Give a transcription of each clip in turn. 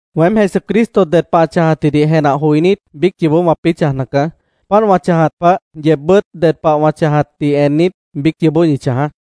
Weém Jesucristo ded pah ã chãjatjidih jenah joinít, biíc yoobó wãpĩ́ chãjna caá. Páant wã chãjat pah, yeebbʉ́t ded pah wã chãjatdih ennit, biíc yoobó ñi chãjaá.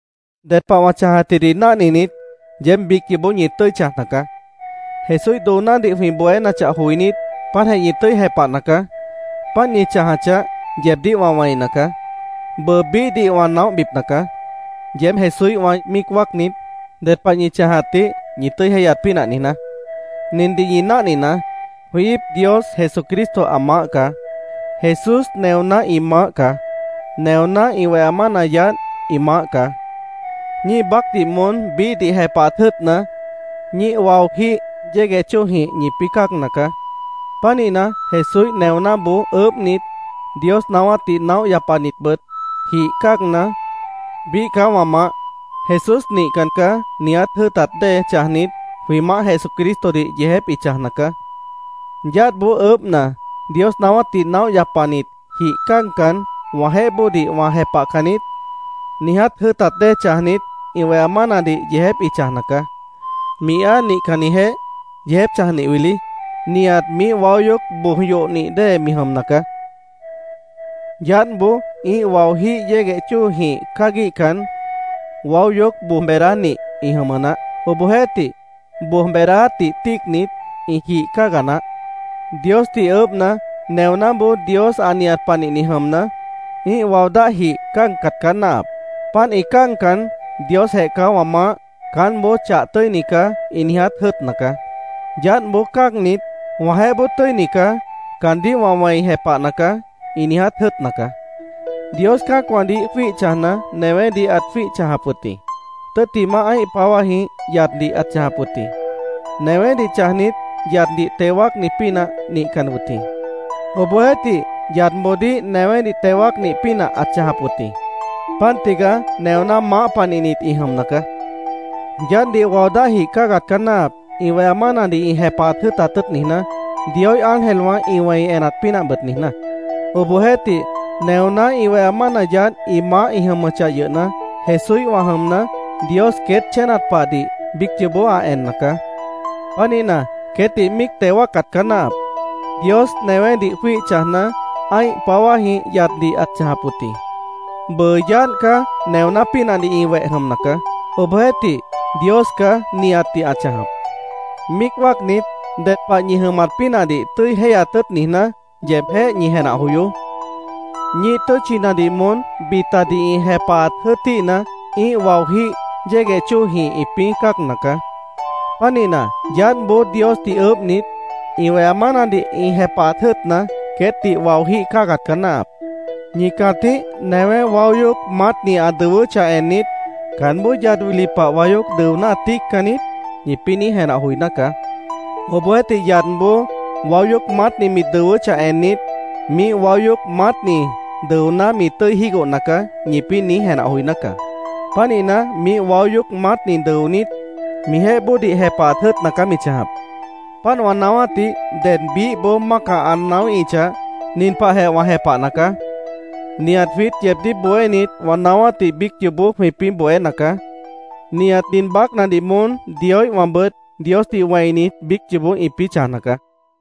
Ded pah wã chãjatjidih náhninit, yeéb biíc yoobó ñi tʉ́i chãjna caá. Jesúíh doonádih jwĩ bohénachah joinít, páantjeh ñi tʉ́i jepahna caá. Páant ñi chãjachah, yeebdíh wã wẽina caá. Bʉʉ biíhdih wã naóhbipna caá, yeéb Jesúíhwã míic wáacnit, ded pah ñi chãjatdih ñi tʉ́i jéihyat pínah niijná. Nindih ñi náhninaá: Jwĩ íip Dios Jesucristo ã maáh caá. Jesús neoná ĩ maáh caá. Neoná ĩ weha mána yaádh ĩ maáh caá. Ñíih baácdih moón biíhdih jepahat jʉ́ʉtna, ñíih waojíh yégueh chóojĩh ñipĩ́ cáagna caá. Pánihna, Jesúíh neonáboó ʉʉ́bhnit, Dios naáwátdih naóh yapanitbʉt jih cáagna, “Biíh caá wã maáh. Jesús nihcan caá”, niiját jʉ́ʉtat dée chãjnit, jwĩ Maáh Jesucristodih yeejép ĩ chãjna caá. Yaádhboó ʉʉ́bhna, Dios naáwátdih naóh yapanit, jih cáagcan, “Wãjeéh bóodih wã jepahcan niít”, niiját jʉ́ʉtat dée chãjnit, ĩ weha mánadih yeejép ĩ chãjna caá. Mi áa nihcannijeéh yeejép chãjnih wili, nihat miíh waó yoóc boj yohnih dée mi jʉmna caá. Yaádhboó ĩ́ih waojíh yégueh chóojĩh cáaguíhcan, waó yoóc boj beedánih ĩ jʉmʉ naáh. Obohjeéhtih, boj beedáátdih tíicnit, ĩ jih cáaga naáh. Diosdih ʉʉ́bhna, neonáboó Dios ã nihat panihni jʉmna, ĩ́ih wao dáhjih cáagcat caá náahap. Páant ĩ cáagcan, “Diosjeh caá wã maáh. Caánboó chah tʉ́ini caá”, ĩ niiját jʉ́ʉtna caá. Yaádhboó cáagnit, “Wãjeéh bóo tʉ́ini caá. Caandíh wã wẽi jepahna caá”, ĩ niiját jʉ́ʉtna caá. Dios cã́acwãdih jwíih chãjna, newédih ãt jwíih chãjap wʉt jĩ. Tʉ́ttimah ã́ih páwájĩh yaddih ãt chãjap wʉt jĩ. Newédih chãjnit, yaddih teo wáacni pínah nihcan wʉt jĩ. Obohjeéhtih, yadboodíh newédih teo wáacnih pínah ãt chãjap wʉt jĩ. Páant tigaá neoná maáh panihnit ĩ jʉmna caá. Yaádhdih wao dáh jih cáagat caá náahap, ĩ weha mánadih ĩ jepahat jʉ́ʉtat tʉ́ʉt niijná, Dioíh ángelwã ĩ wẽi enat pínah bʉt niijná. Obohjeéhtih, neoná ĩ weha mána yaádh ĩ maáh ĩ jʉmʉchah yʉhna, Jesúíhwã jʉmna, Dios queét chénat pahdih biíc yoobó ã enna caá. Pánihna, queétdih míic teo wáacat caá náahap. Dios newédih jwíih chãjna, ã́ih páwájĩh yaddih ãt chãjap wʉt jĩ. Bʉʉ yaádh caá neoná pínahdih ĩ weh jʉmna caá. Obohjeéhtih, Dios caá nihatdih ã chãjap. Míic wáacnit, ded pah ñi jʉmat pínahdih tʉ́i jéihyat tʉ́ʉt niijná, yeebjéh ñi jenah joyoó. Ñíih tʉ́tchinadih moón bitadih ĩ jepahat jʉ́ʉtíhna, ĩ́ih waojíh yégueh chóojĩh ĩpĩ́ cáagna caá. Pánihna, yaádhboó Diosdih ʉʉ́bhnit, ĩ weha mánadih ĩ jepahat jʉ́ʉtna, queétdih waojíh cáagat caá náahap. Ñi cãtíh newé waó yoóc maátni ã dʉwʉ́chah ennit, “¿Caánboó yad wili pah waó yoóc dʉoná, ã tíiccan niít?” ñipĩ́ niíj jenah joiná caá. Obohjeéhtih, yadboó waó yoóc maátni mi dʉwʉ́chah ennit, “Miíh waó yoóc maátni dʉoná, mi tʉ́i jígohna caá”, ñipĩ́ niíj jenah joiná caá. Pánihna, miíh waó yoóc maátni dʉonít, mijeéh bóodih jepahat jʉ́ʉtna caá mi chãjap. Páant wã naáwátdih ded biíhboó mácah ã naáwíhichah, nin pahjeh wã jepahna caá: Nihat jwiít yeebdíh bohénit wã naáwátdih biíc yoobó jwĩpĩ́ bohéna caá. Nihat nin baácnadih moón Dioíhwãbʉt Diosdih wẽinit, biíc yoobó ĩpĩ́ chãjna caá.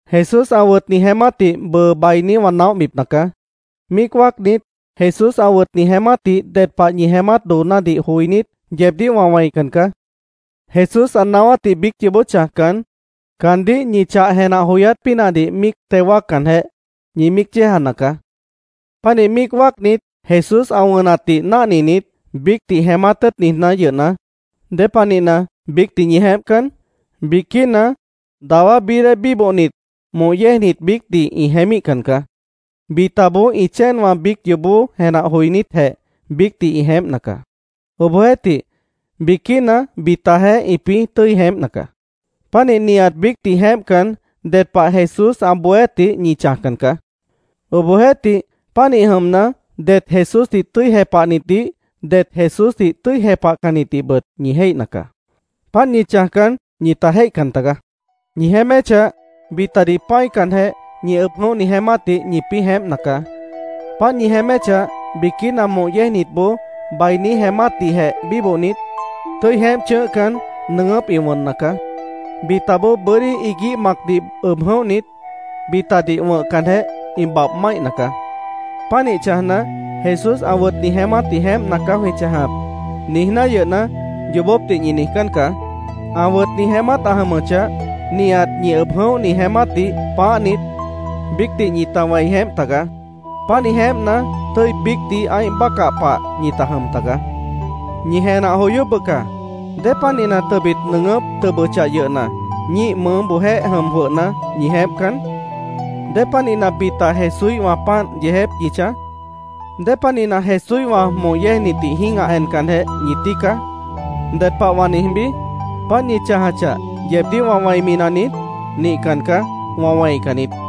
Jesús ã wʉtni jeémátdih bʉʉ bainí wã naóhbipna caá. Míic wáacnit, Jesús ã wʉtni jeémátdih ded pah ñi jeémát doonádih joinít, yeebdíh wã wẽican caá. Jesús ã naáwátdih biíc yoobó chãjcan, caandíh ñi chah jenah joyát pínahdih míic teo wáaccanjeh, ñi míic yéejana caá. Pánih míic wáacnit, Jesús ã wʉnatdih náhninit, biícdih jeémát tʉ́ʉt niijná yʉhna, ¿Dépanihna, biícdih ñi jeémpcan? Biquína dawá bií dée bíbohnit moh yéejnit biícdih ĩ jeémíhcan caá. Bitaboó ĩ chéenwã biíc yoobó jenah joinítjeh biícdih ĩ jeémpna caá. Obohjeéhtih, biquína bitajeéh ĩpĩ́ tʉ́i jeémpna caá. Pánih nihat biícdih jeémpcan, ded pah Jesús ã bohéátdih ñi chãjcan caá. Obohjeéhtih, pánih jʉmna, det Jesúsdih tʉ́i jepahnitdih, det Jesúsdih tʉ́i jepahcannitdihbʉt ñi jéihna caá. Páant ñi chãjcan, ñita jéihcan tagaá. Ñi jeéméchah, bitadih pã́icanjeh, ñi ʉb jʉ̃óhni jeémátdih ñipĩ́ jeémpna caá. Páant ñi jeéméchah, biquína moh yéejnitboó bainí jeémátdihjeh bíbohnit, tʉ́i jeémp chʉ̃ʉ́hcan, nʉʉgʉ́p ĩ wʉnna caá. Bitaboó bʉ́dí iguíh macdih ʉb jʉ̃óhnit, bitadih wʉ̃hcanjeh, ĩ babh máihna caá. Pánih chãjna, “Jesús ã wʉtni jeémátdih jeémpna caá jwĩ chãjap”, niijná yʉhna, yoobópdih ñi niijcán caá. Ã wʉtni jeémát ã jʉmʉchah, nihat ñi ʉb jʉ̃óhni jeémátdih pãáhnit, biícdih ñita wẽi jeémp tagaá. Pánih jeémpna, tʉ́i biícdih ã́ih bácah pah ñita jʉm taga. ¡Ñi jenah joyoó bʉca! ¿Dépanihna tʉbit nʉʉgʉ́p tʉbʉchah yʉhna, ñíih mʉʉ́boojéh jʉm jwʉhna, ñi jeémpcan? ¿Dépanihna bita Jesúíhwã páant yeejép ñi chãj? ¿Dépanihna Jesúíhwã moh yéejnitdih jĩ́gah encanjeh ñi tíica? ¿Ded pah wã niijbí? ¿Páant ñi chãjachah, yeebdíh wã wẽimi naniít? Nihcan caá. Wã wẽican niít.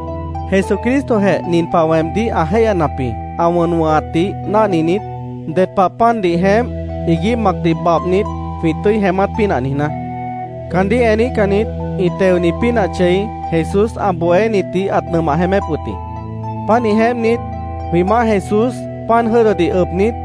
Jesucristojeh nin pah weemdíh ã jéihyanap jĩ, ã wʉn wʉ̃hatdih náhninit, ded pah pandih jeémp, iguíh macdih babhnit, jwĩ tʉ́i jeémát pínah niijná: Caandíh eníhcannit ĩ teoni pínah chei Jesús ã bohénitdih ãt nʉmah jeémép wʉt jĩ. Pánih jeémpnit, jwĩ Maáh Jesús pan jʉ́dʉdih ʉbnit,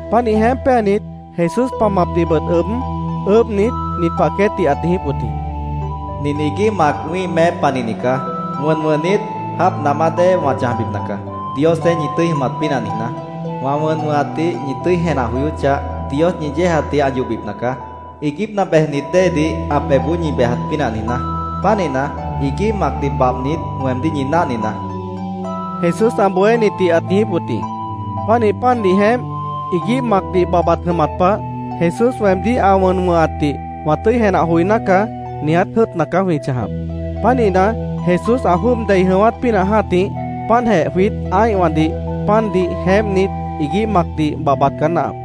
Pánih jeémp péanit, Jesús pamapdihbʉt ʉb, ʉʉ́bhnit, nin pah queétdih ãt niijíp wʉt jĩ: “Nin iguíh mac wĩ́ih meép panihni caá. Wʉn wʉ̃hnit, jáap namá dée wã chãjbipna caá, Diosjeéh ñi tʉ́i jʉmat pínah niijná. Wã wʉn wʉ̃hatdih ñi tʉ́i jenah joyóchah, Dios ñi yéejatdih ã yohbipna caá, iiguípna bejnit déedih ã pebhboó ñi bejat pínah niijná. Pánihna, iguíh macdih babhnit, weemdíh ñi náhninaá”, Jesús ã bohénitdih ãt niijíp wʉt jĩ. Pánih pandih jeémp, iguíh macdih babhbat jʉmat pah “Jesús weemdíh ã wʉn wʉ̃hatdih wã tʉ́i jenah joiná caá”, niiját jʉ́ʉtna caá jwĩ chãjap. Pánihna, Jesús ã jwʉ́ʉb dei jʉ̃ʉ́wát pínah jã́tih páantjeh jwiít ã́ihwãdih pandih jeémpnit, iguíh macdih babhbat caá náahap.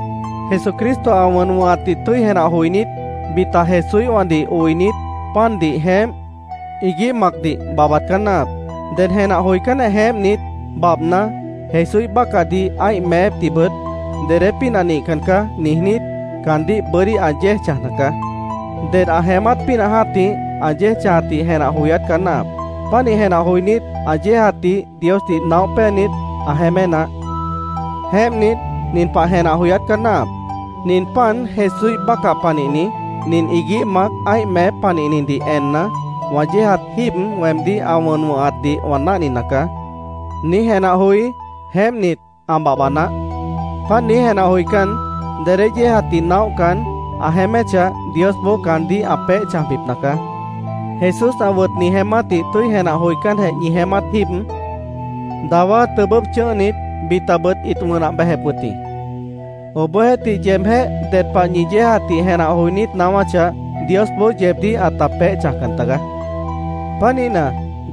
Jesucristo ã wʉn wʉ̃hatdih tʉ́i jenah joinít, bita Jesúíhwãdih oinit, pandih jeémp, iguíh macdih babhbat caá náahap. Ded jenah joicánjeh jeémpnit, babhna, Jesúíh bácahdih ã́ih meépdihbʉt “Dedé pínah nihcan caá”, niijnít, caandíh bʉ́dí ã yéej chãjna caá. Ded ã jeémát pínah jã́tih, ã yéej chãjatdih jenah joyát caá náahap. Pánih jenah joinít, ã yéejatdih Diosdih naóh péanit, ã jeémé naáh. Jeémpnit, nin pah jenah joyát caá náahap: “Nin pan Jesúíh bácah panihni, nin iguíh mac ã́ih meép panihnidih enna, wã yéejat jíib weemdíh ã wʉn wʉ̃hatdih wã náhnina caá”, niíj jenah joí, jeémpnit, ã babhba naáh. Páant niíj jenah joicán, dedé yéejatdih naóhcan, ã jeéméchah, Diosboó caandíh ã peéh chãjbipna caá. Jesús ã wʉtni jeémátdih tʉ́i jenah joicánjeh ñi jeémát jíib, dawá tʉbʉ́p chʉ̃ʉ́hnit, bitabʉt ĩt wʉnah bejep wʉt jĩ. Obohjeéhtih, yeebjéh ded pah ñi yéejatdih jenah joinít naáwáchah, Diosboó yeebdíh ãta peéh chãjcan tagaá. Pánihna,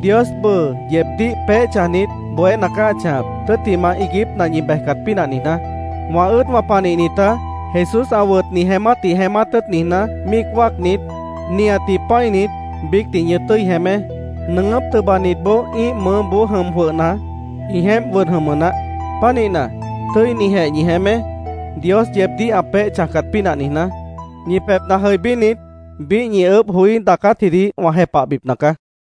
Dios bʉʉ yeebdíh peéh chãjnit, bohéna caá ã chãjap, tʉ́ttimah iiguípna ñi bejcat pínah niijná. Wã ʉ́ʉdwã panihnitá, Jesús ã wʉtni jeémátdih jeémát tʉ́ʉt niijná, míic wáacnit, nihatdih pã́init, biícdih ñi tʉ́i jeémé. Nʉʉgʉ́p tʉbanitboó ĩ́ih mʉʉ́boó jʉm jwʉhna, ĩ jeémp wʉd jʉmʉ naáh. Pánihna, tʉ́inijeh ñi jeémé, Dios yeebdíh ã peéh chãjcat pínah niijná. Ñi pebhna jʉibínit, biíh ñi ʉʉ́bh joí daacátjidih wã jepahbipna caá.